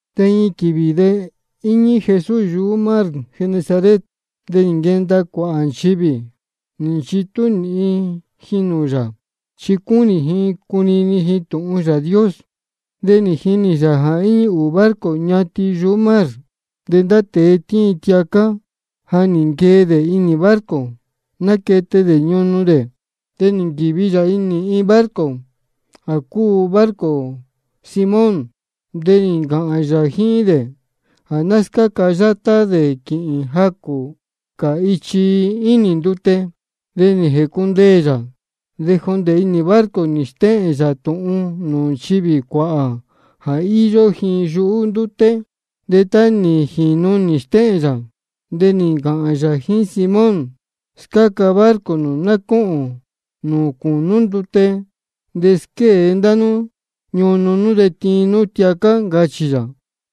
De iin quīvī de íñí Jesús yuhú mar Genesaret. De nī nquenda cuāhā nchivī, nī nchitú nīhin ji nūū yā, chi cúnī ji cunini ji tūhun Yāā Dios. De nī jinī yā jā íñí ūū barco ñatin yuhú mar. De ndá tēe tíin tiacá, ja nī nquee dē inī barco, náquete dē ñunu dē. De nī nquīvi yā inī iin barco jā cúu barco Simón. De nī ncāhān yā jíín dē jā ná scáca yátá dē quīhīn jacū cā ichi ínī ndute. De nī jēcundeē yā, de jondē inī barco nī stéhēn yā tūhun nūū nchivī cuāhā jā íyó ji yuhú ndúté. De tá nī jīnu nī stéhēn yā, de nī ncāhān yā jíín Simón: Scáca barco nū ná cóhōn nūū cūnú ndute, de squée ndá nú ñunu nú, de tiin nú tiacá, ncachī yā.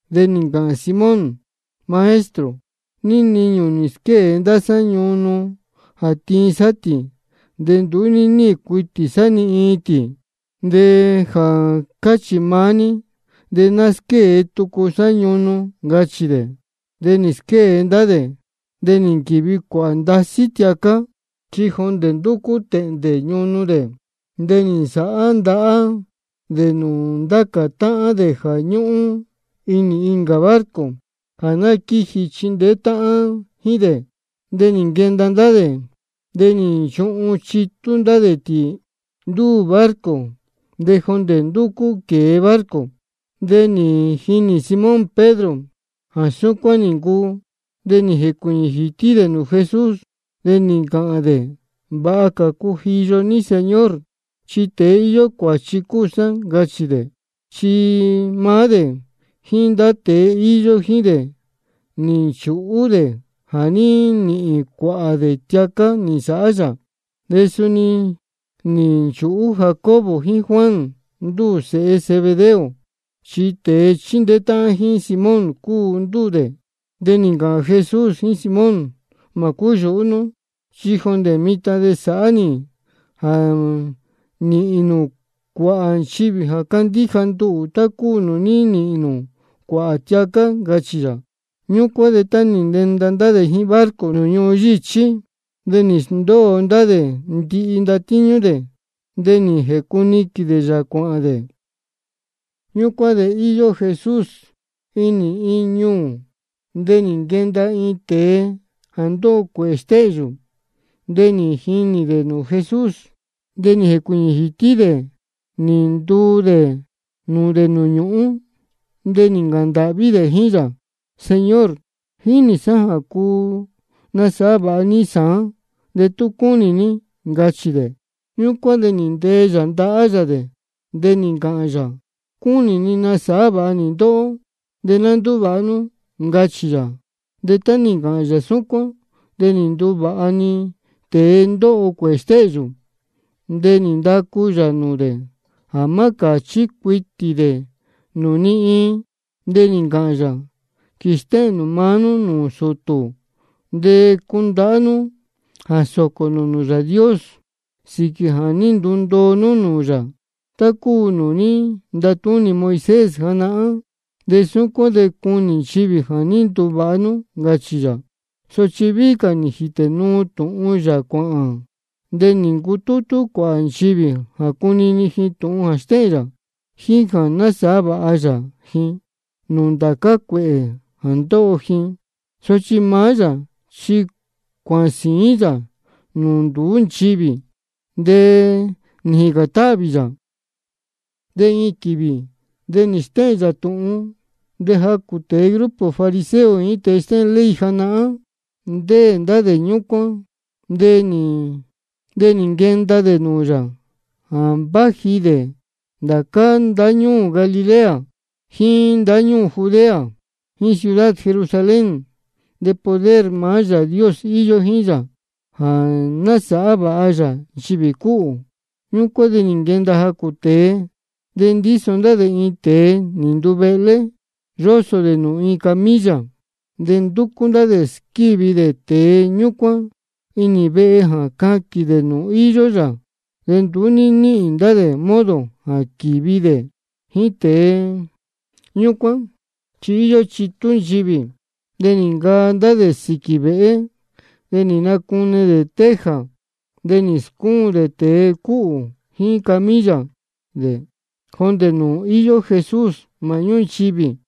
De nī ncāhān Simón: Maestro, níí niñū nī squée ndá sá ñunu jā tiin sá tī, de nduú ní níhīn cuitī sá ni iin tī. De jā cáchī maá ní, de ná squée tucu sá ñunu, ncachī dē. De nī squée ndá dē, de nī nquīvi cuāhā ndasí tiacá, chi jondē ndúcú tēhndē ñunu dē. De nī nsāhá ndahá ndá dē nūū ndá cā táhán dē jā ñúhún inī incā barco, jā ná quíji chindeé táhán jíín dē. De nī nquenda ndá dē, de nī nchuhun chitú ndá dē tī ndúū barco, de jondē ndúcú quēe barco. De nī jinī Simón Pedro jā súcuán nī ncuu. De nī jēcuīñī jītí dē nūū Jesús, de nī ncāhān dē: Vāha cā cujiyo ní Señor, chi tēe íyó cuāchi cúu sá, ncachī dē. Chi maá dē jíín ndá tēe íyó jíín dē, nī nchūhú dē jā ní nīhīn cuāhā dē tiacá nī nsāhá yā. De suni nī nchūhú Jacobo jíín Juan, ndúū sēhe Zebedeo, chi tēe chíndeé táhán jíín Simón cúu ndúū dē. De nī ncāhān Jesús jíín Simón: Mā cúyūhú nú, chi jondē mitan de sāhá nī jā nīhīn nū cuāhā nchivī jā candíja nduhū, tá cúu nūū ní nīhīn nū cuāhā tiacá, ncachī yā. Ñúcuán de tá nī nenda ndá dē jíín barco nūū ñuhun yíchí, de nī sndóo ndá dē ndihi ndatíñú dē, de nī jēcuniquīn dē yā cuāhān dē. Ñúcuán de íyó Jesús inī iin ñuū, de nī nquenda iin tēe jā ndóho cuēhē stéhyū. De nī jinī dē nūū Jesús, de nī jēcuīñī jītí dē nī ntuu dē nūū dē nūū ñūhún, de nī ncāhān ndāhví dē jíín yā: Señor, jínī sá jā cuu nasāhá vāha ní sāán de tú cúnī ní, ncachī dē. Ñúcuán de nī ntee yā ndahá yā dē, de nī ncāhān yā: Cúnī ni nasāhá vāha nī ndóhó, de ná ndúvāha nú, ncachī yā. De tá nī ncāhān yā súcuán, de nī nduvāha-ni tēe ndóho cuēhē stéhyū. De nī ndacu yā nūū dē jā má cāchí cuitī dē nūū ni iin. De nī ncāhān yā: Quīstéhēn nū maá nú nūū sūtū, de cundahá nú jā sōcō nū nūū Yāā Dios sīquī jā ní ndundoo nú nūū yā, tá cúu nūū ní ntatúnī Moisés janahán. De súcuán de cunī nchivī jā ní nduvāha nú, ncachī yā. Sochi víhí cā nī jītē nuu tūhun yā cuāhān. De nī ncutútú cuāhā nchivī jā cunini ji tūhun jā stéhēn yā, jíín jā nasāhá vāha yā ji nūū ndācá cuēhē jā ndóho ji. Sochi maá yā chi cuāhān sīín yā nūū nduú nchivī, de nī jīcān táhvī yā. De iin quīvī de stéhēn yā tūhun, de jacū tēe grupo fariseo jíín tēe stéhēn ley janahán, ndéē ndá dē ñúcuán. De nī nquenda dē nūū yā jā váji dē ndācá ndáñúū Galilea, jíín ndáñúū Judea, jíín ciudad Jerusalén. De poder maá Yāā Dios íyó jíín yā jā násāhá vāha yā nchivī cúhū. Ñúcuán de nī nquenda jacū tēe, de ndíso ndá dē iin tēe nī nduvehlé, yósō dē nūū iin camilla. De ndúcú ndá dē squívi dē tēe ñúcuán inī vehe jā caquīn dē nūū íyó yā. De nduú ní níhīn ndá dē modo jā quīvi dē jíín tēe ñúcuán, chi íyó chitú nchivī. De nī ncaa ndá dē sīquī vēhé, de nī nacune dē teja. De nī scúun dē tēe cúhū jíín camilla dē jondē nūū íyó Jesús māhñú nchivī.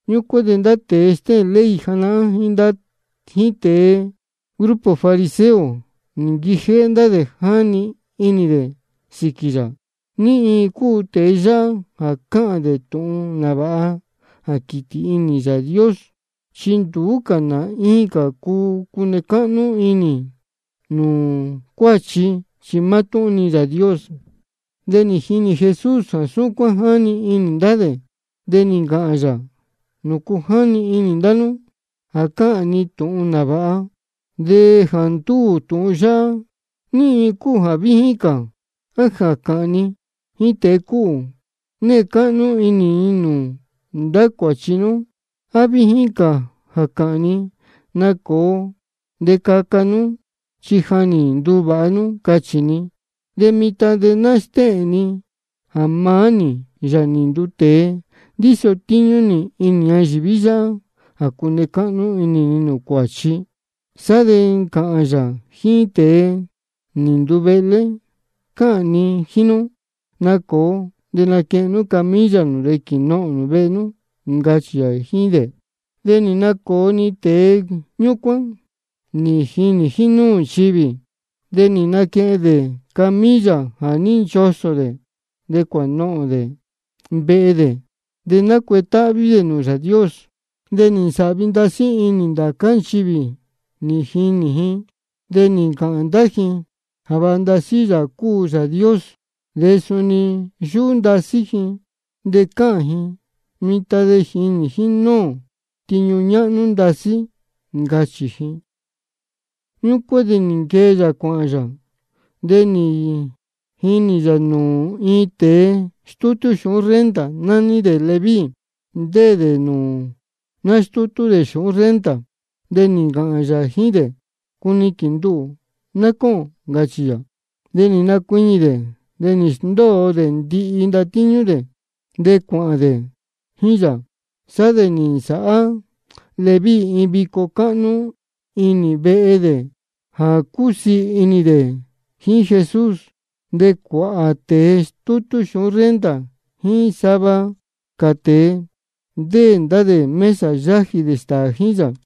Ñúcuán de ndá tēe stéhēn ley janahán jíín tēe grupo fariseo, nī nquijéhé ndá dē jáni inī dē sīquī yā: ¿Ní iin cā cúu tēe yáhá jā cáhān dē tūhun nāvāha jā quītī inī Yāā Dios? Chi nduú cā nā incā cuu cune cáhnú inī nūū cuāchi, chi mátúhún-ni Yāā Dios. De nī jinī Jesús jā súcuán jáni inī ndá dē, de nī ncāhān yā: ¿Nūcu jáni inī ndá nú jā cáhān ni tūhun nāvāha? De jā ndúū tūhun yáhá, ¿ní iin cúu jā víjín cā? ¿A jā cāhān ni jíín tēe cúhū: Née cáhnú inī ni nūū ndá cuāchi nú? ¿A víjín cā jā cāhān ni: Nacōo de caca nú, chi ja nī nduvāha nú, cachī ni? De mitan de ná stéhēn ni jā maá nī, Yāā nī nduu tēe, ndíso tíñú nī inī ñayīví yáhá jā cune cáhnú inī ni nūū cuāchi. Sá de nī ncāhān yā jíín tēe nī nduvehlé: Cáhān ni jíín nú, nacōo de naquehen nú camilla nū de quīnohōn nū vehe nú, ncachī yā jíín dē. De nī nacōo-ni tēe ñúcuán, nī jinī jínúū nchivī. De nī naquehen dē camilla jā ní nchosō dē, de cuānohōn dē vehe dē. De nácuetáhví dē nūū Yāā Dios. De nī nsāhvi ndasí inī ndācá nchivī nī jinī ji, de nī ncāhān ndá ji jā vāha ndasí Yāā cúu Yāā Dios. De suni yúhú ndasí ji de cáhān ji: Mitan de nī jinī ō tiñu ñáhnú ndasí, ncachī ji. Ñúcuán de nī nquee yā cuāhān yā, de nī jinī yā nūū iin tēe stútú xūhún renta, nání dē Leví, ndéē dē nūū nástútú dē xūhún renta. De nī ncāhān yā jíín dē: Cuniquīn nduhū ná cóhōn, ncachī yā. De nī nacuiñī dē, de nī sndóo dē ndihi ndatíñú dē, de cuāhān dē jíín yā. Sá de nī nsāhá Leví iin vico cáhnú inī vehe dē jā cúsiī inī dē jíín Jesús. De cuāhā tēe stútú xūhún renta jíín sava cā tēe, ndéē ndá dē mesa yájī dē stāā jíín yā.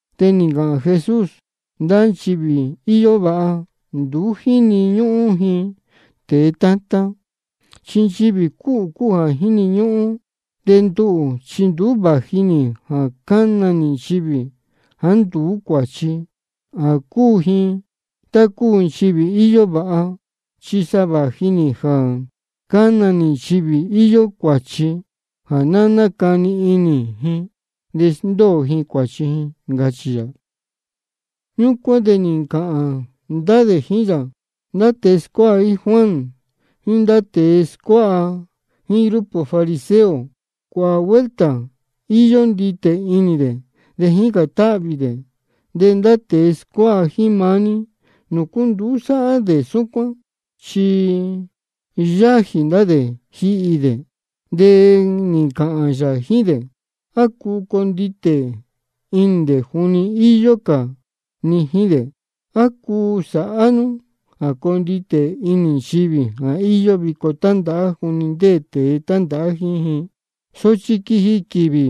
De nī ncāhān Jesús: Ndá nchivī íyó vāha, nduú jíni ñúhún ji tēe tátán, chi nchivī cúhū cúu jā jíni ñúhún. De nduhū chi nduú vāji nī jā cana nī nchivī jāá nduú cuāchi, jā cúu ji tá cúu nchivī íyó vāha. Chi sa vāji nī jā cána nī nchivī íyó cuāchi, jā ná nácani inī ji de sndóo ji cuāchi ji, ncachī yā. Ñúcuán de nī ncāhān ndá dē jíín yā: Ndá tēe scuáha jíín Juan, jíín ndá tēe scuáha jíín grupo fariseo, cuāhā vuelta íyó nditē inī dē de jícān táhvī dē. De ndá tēe scuáha jíín maá ní, ¿nūcu nduú sáhá dē súcuán? Chi yájī ndá dē jíhi dē. De nī ncāhān yā jíín dē: ¿A cuu conditē inī dē juni íyó cā ni jíín dē? ¿A cuu sāhá nú jā conditē inī nchivī íyó vico tándāhá juni ndéē tēe tándāhá jíín ji? Sochi quiji quīvī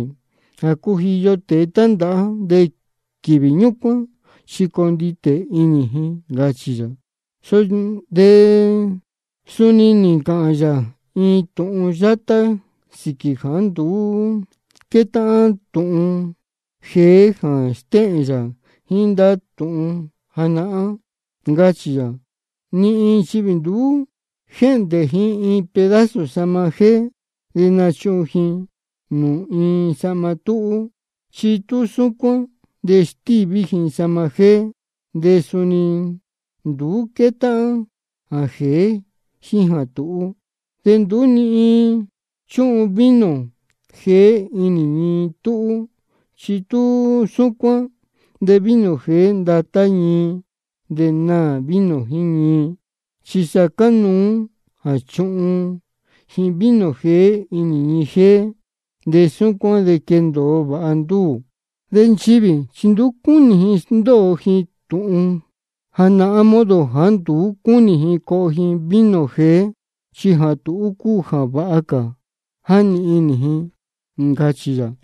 jā cujiyo tēe tándāhá, de quīvī ñúcuán chi conditē inī ji, ncachī yā. De suni nī ncāhān yā iin tūhun yátá sīquī jāá nduú quétáhán tūhun jeé jā stéhēn yā jíín ndá tūhun janahán. Ncachī yā: Ni iin nchivī nduú jéhndē ji iin pedazo sahma jéé, de nachuhun ji nūū iin sahma túhú. Chi tú súcuán, de stíví ji sahma jéé, de suni nduú quétáhán jā jēé jíín jā tūhú. De nduú ni iin chúhun vino jeé inī ñii túhú. Chi tú súcuán, de vino jeé ndatá ñii, de naā vino jíín ñii. Chi sa cánuú jā chuhun ji vino jeé inī ñii jéé, de súcuán de quendōo vāha ndúū. De nchivī chi nduú cúnī ji sndóo ji tūhun janahán, modo jāá nduú cúnī ji coho ji vino jeé, chi jā tūhú cúu jā váha cā, jáni inī ji, ncachī yā.